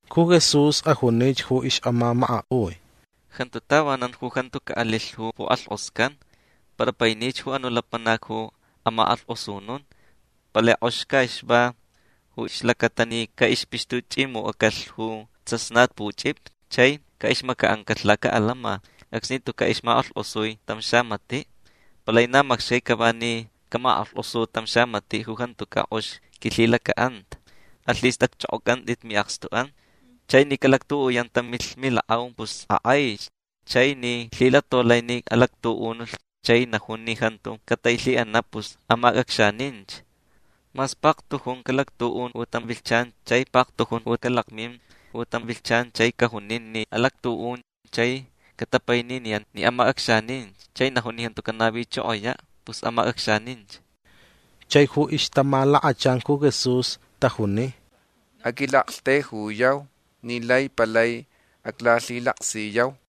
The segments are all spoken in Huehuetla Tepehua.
Ju Jesús ajunich ju ixʼamamakaʼui: ―Jantu tavanan ju jantu caʼalilh ju pukʼalhkʼoscan. Para painich ju anuʼ lapanac ju amakʼalhkʼosnun. Palai kʼox caʼixva ju ixlacata ni caʼixpixtuchʼimucʼacalh ju tsasnatpuchʼipi chai caʼixmacaʼancalh lacaʼalama acsni tucaʼ ixmakʼalhkʼosui tam xamatiʼ. Palai na macxcai cava ni camakʼalhkʼosu tam xamatiʼ ju jantucaʼ kʼox quilhilacaʼanta. Alhistʼacchʼokʼocʼantʼit miʼakstuʼan. Chai ni calactuʼuyan tam milakʼau pus akʼaich. Chai ni lhilatolai ni alactuʼunulh chai najun ni jantu catailhiʼanaʼ pus amacʼacxaninch. Mas paktujun calactuʼun ju tam vilhchan chai paktujun ju calakmin ju tam vilhchan chai cajunin ni alactuʼun chai catapaininiyan ni amacʼacxaninch chai najun ni jantu canavichokoyaʼ pus amacʼacxaninch. Chai ju ixtamalakachan ju Jesús tajuni: ―Aquilaʼaktaijuyau ni lai palai aclalhilaksiyau.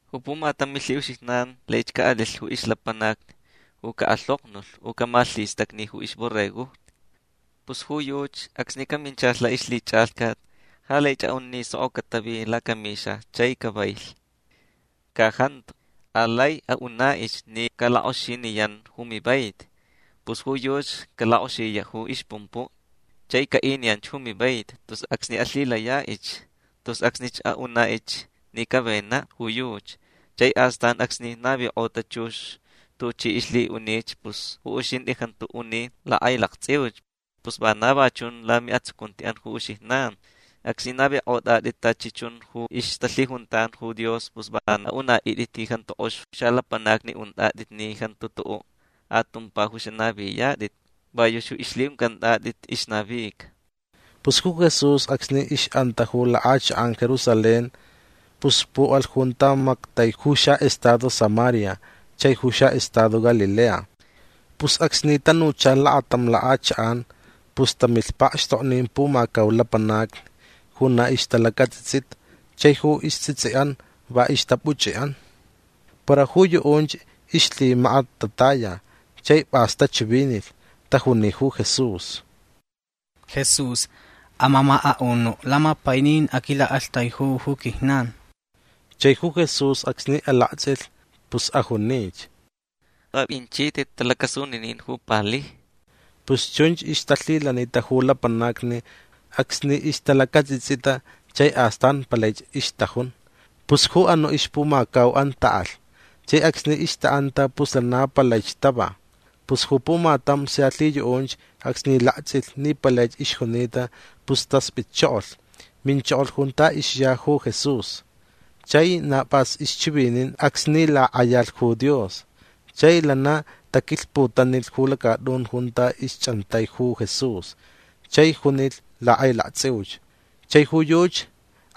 Ju pumatam milhiʼuxijnan laich caʼalilh ju ixlapanac ju caʼalhoknulh u camalhistacni ju ixborregojni. Pus ju yuchi acsni caminchalh laʼixlhichʼalhcat ja laich aʼun ni soko catavi lacamixa chai cavailh. Ca jantu. Alai aʼunaʼich ni calakʼoxiniyan ju mivaiti. Pus ju yuchi calakʼoxiyaʼ ju ixpumpuʼ chai caʼiniyanch ju mivaiti tus acsni alhilayaʼich. Tus acsnich aʼunaʼich ni cavenaʼ ju yuchi. Chai astan acsni navikʼota chux tuchi ixlhiʼunich pus ju uxintʼi jantu uni lakʼailaktsʼiuch. Pus vana va chun lamiʼatsucuntiʼan ju uxijnan. Acsni navikʼotʼatʼit tachi chun ju ixtalhijuntan ju Dios pus va anaʼuntʼit ni jantu kʼox xalapanacni untʼatʼit ni jantu tuʼuʼ atumpa ju xanaviyatʼit. Va yuchi ju ixlhiʼuncʼantʼatʼit ixnavica. Pus ju Jesús acsni ixʼanta ju lakʼachakʼan Jerusalén pus puʼalh junta mactai ju xaʼestado Samaria chai ju xaʼestado Galilea. Pus acsni tanucha lakatam lakʼachakʼan pus tamilh pakxtoknin pumacau lapanacni ju na ixtalacatsʼitsʼita chai ju istsʼitsʼiʼan va ixtapuchʼiʼan. Para ju yuʼunch ixlhimakat tataya. Chai pʼas tachivinilh. Tajuni ju Jesús: ―Jesús amamakaʼunuʼ. Lamapainin aquilaʼaktaiju ju quijnan. Chai ju Jesús acsni alaktsʼilh pus ajunich: ―Apʼinchitʼit talacasuninin ju palijni. Pus chunch ixtalhilanita ju lapanacni acsni ixtalacatsʼitsʼita chai astan palaich ixtajun. Pus ju anuʼ ixpumacauʼan taʼalh. Chai acsni ixtaʼanta pus lana palaich tava. Pus ju pumatam sia lhiyuʼunch acsni laktsʼilh ni palaich ixjunita pus taspʼitchokolh. Minchokolh junta ixya ju Jesús. Chai na pʼas ixchivinin acsni lakʼayalh ju Dios. Chai lana taquilhputanilh ju lacatʼun junta ixchʼantaiti ju Jesús chai junilh lakʼailaktsʼiuch. Chai ju yuchi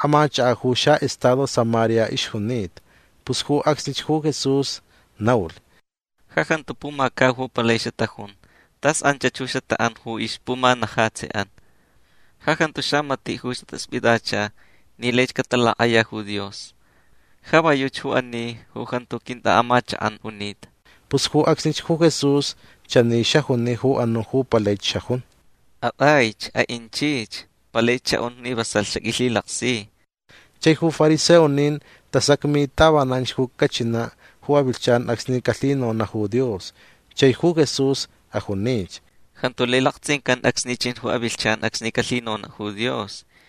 amachakaʼ ju xaʼestado Samaria ixjunita. Pus ju acsnich ju Jesús naulh: ―Ja jantu pumacau ju palai xatajun. Tas anchach ju xataʼan ju ixpumanajatsiʼan. Ja jantu xamatiʼ ju xataspʼitacha ni laich catalakʼaya ju Dios. Ja va yuchi ju ani ju jantu quintʼaʼamachakʼan junita. Pus ju acsnich ju Jesús chani xajuni ju anuʼ ju palaich xajun: ―Atʼaich. Aʼinchich. Palaich xaʼun ni vasalh xaqʼuilhilaksi. Chai ju fariseonin tasacmi tavananch ju cachinaʼ ju avilhchan acsni calhinonaʼ ju Dios. Chai ju Jesús ajunich: ―Jantu lai laktsʼincan acsni chin ju avilhchan acsni calhinonaʼ ju Dios.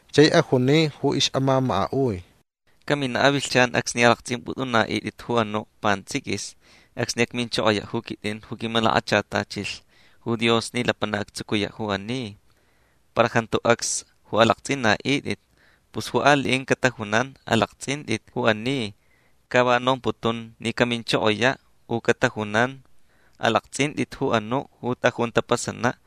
Chai ajuni ju ixʼamamakaʼui: ―Caminaʼ avilhchan acsni alaktsʼimpʼutʼunaʼitʼit ju anuʼ pantsʼiquis acsni acminchokoyaʼ ju quitʼin ju quimalakachatachilh ju Dios ni lapanac actsucuyaʼ ju ani. Para jantu acs ju alaktsʼinaʼitʼit. Pus ju aliʼin catajunan: “Alaktsʼintʼit ju ani. Ca va nomputun ni caminchokoyaʼ”. U catajunan: “Alaktsʼintʼit ju anuʼ ju tʼajun tapasanaʼ”.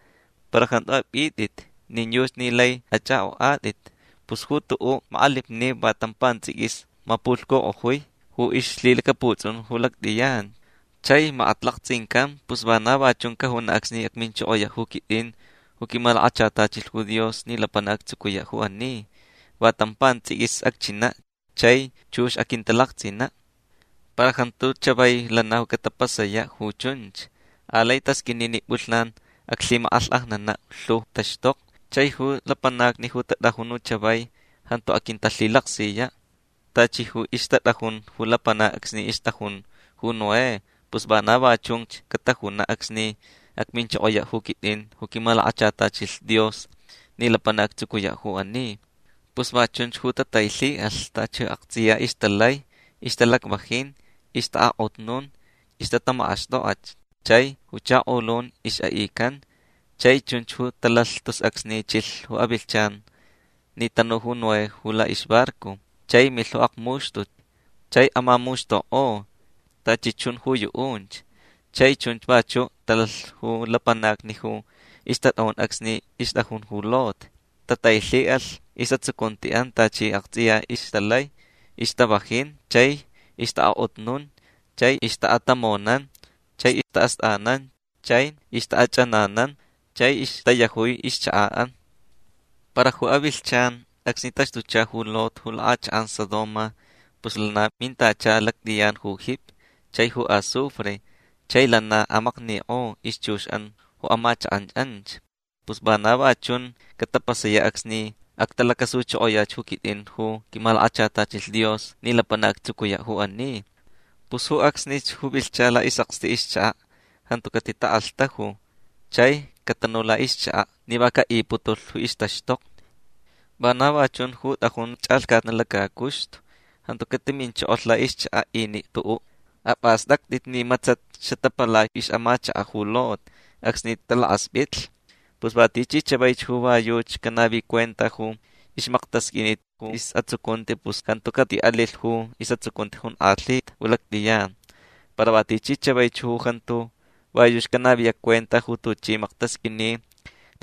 Para jantu apʼitʼit nin yuchi ni lai achʼakʼokʼatʼit. Pus ju tuʼuʼ makʼalipniʼ va tam pantsʼiquis mapulhcukʼojui ju ixlhilacaputsʼun ju lactʼiyan chai makat laktsʼincan. Pus vana va chun cajunaʼ acsni acminchokoyaʼ ju quitʼin ju quimalakachatachilh ju Dios ni lapanac actsucuyaʼ ju ani. Va tam pantsʼiquis acchinaʼ chai chux aquintalaktsʼinaʼ. Para jantu chavai lana ju catapasayaʼ ju chunch. Alai tasqʼuini ni pʼulhnan aclhimakʼalhkʼajnanaʼ lhu taxtokni. Chai ju lapanacni ju tatʼajun ju chavai jantu aquintalhilaksiyaʼ. Tachi ju ixtatʼajun ju lapanacni acsni ixtʼajun ju Noé pus vana va chunch catajunaʼ acsni acminchokoyaʼ ju quitʼin ju quimalakachatachilh Dios ni lapanac actsucuyaʼ ju ani. Pus va chunch ju tatailhiʼalh tachi aktsʼiya ixtalai. Ixtalacvajin. Ixtaʼakʼotnun. Ixtatamakʼaxtʼokʼach chai ju chakolun ixʼaʼican. Chai chunch ju talalh tus acsni chilh ju avilhchan ni tanu ju Noé ju laʼixbarco. Chai milh ju akmuxtut chai amamuxtukʼo tachi chun ju yuʼunch. Chai chunch vachuʼ talalh ju lapanacni ju ixtatʼajun acsni ixtʼajun ju Lot. Tatailhiʼalh isʼatsucuntiʼan tachi aktsʼiya ixtalai. Ixtavajin chai ixtaʼakʼotnun chai ixʼatamonan chai istaʼastʼanan chai ixtaʼachʼananan chai ixtayajui ixchakaʼan. Para ju avilhchan acsni taxtucha ju Lot ju lakʼachakʼan Sodoma pus lana mintacha lactʼiyan ju jipi chai ju azufre. Chai lana amaknikʼo ixchuxʼan ju amachakʼan anch. Pus vana va chun catapasayaʼ acsni actalacasuchokoyach ju quitʼin ju quimalakachatachilh Dios ni lapanac actsucuyaʼ ju ani. Pus ju acsnich ju vilhcha laʼisʼakstiʼ ixchakaʼ jantu catitakʼalhtaju chai catanu laʼixchakaʼ ni va caʼiputulh ju ixtaxtokni. Vana va chun ju tʼajun chʼalhcatnaʼ lacacuxtu. Jantu catiminchokolh laʼixchakaʼ iniʼ tuʼuʼ. Apʼastʼactʼit ni matsat xatapalai ixʼamachakaʼ ju Lot acsni talakʼaspʼitlh. Pus va tichi chavaich ju va yuchi canavi cuenta ju ixmaktasqʼuinit ju isʼatsucunti pus jantu catiʼalilh ju isʼatsucunti jonkʼalhita ju lactʼiyan. Para va tichi chavaich ju jantu va yuchi canaviyaʼ cuenta ju tuchi maktasqʼuini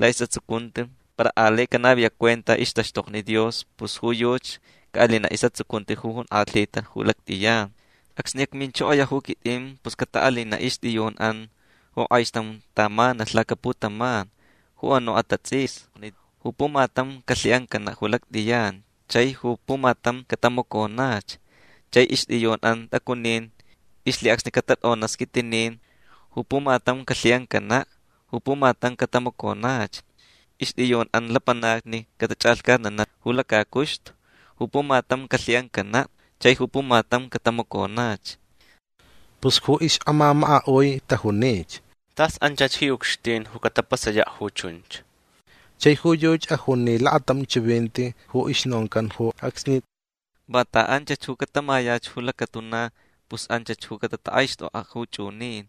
laʼisʼatsucunti para alai canaviyaʼ cuenta ixtaxtokni Dios pus ju yuchi caʼalinaʼ isʼatsucunti ju jonkʼalhita ju lactʼiyan. Acsni acminchokoyaʼ ju quitʼin pus cataʼalinaʼ ixtʼiyunʼan ju kʼaixtam tamanalh lacaputaman ju anuʼ atatsʼisni. Ju pumatam calhiʼancanaʼ ju lactʼiyan chai ju pumatam catamaconach. Chai ixtʼiyunʼan tʼacunin ixlhiʼacsni catatʼonaʼ squitinin. Ju pumatam calhiʼancanaʼ. Ju pumatam catamaconach. Ixtʼiyunʼan lapanacni catachʼalhcatnanaʼ ju lacacuxtu. Ju pumatam calhiʼancanaʼ. Chai ju pumatam catamaconach. Pus ju ixʼamamakaʼui tajunich: ―Tas anchach ji ucxtin ju catapasayaʼ ju chunch. Chai ju yuchi ajuni lakatam chivinti ju ixnoncan ju acsni: ―Vanta anchach ju catamayach ju lacatuna pus anchach ju catatakʼaixtʼokʼaʼ ju chʼunin.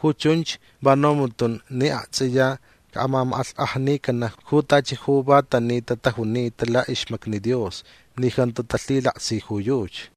Ju chunch va nomputun ni aktsʼiya caʼamamakʼalhkʼajnicanaʼ ju tachi ju va tanita tajunita laʼixmacni Dios ni jantu talhilaksi ju yuchi.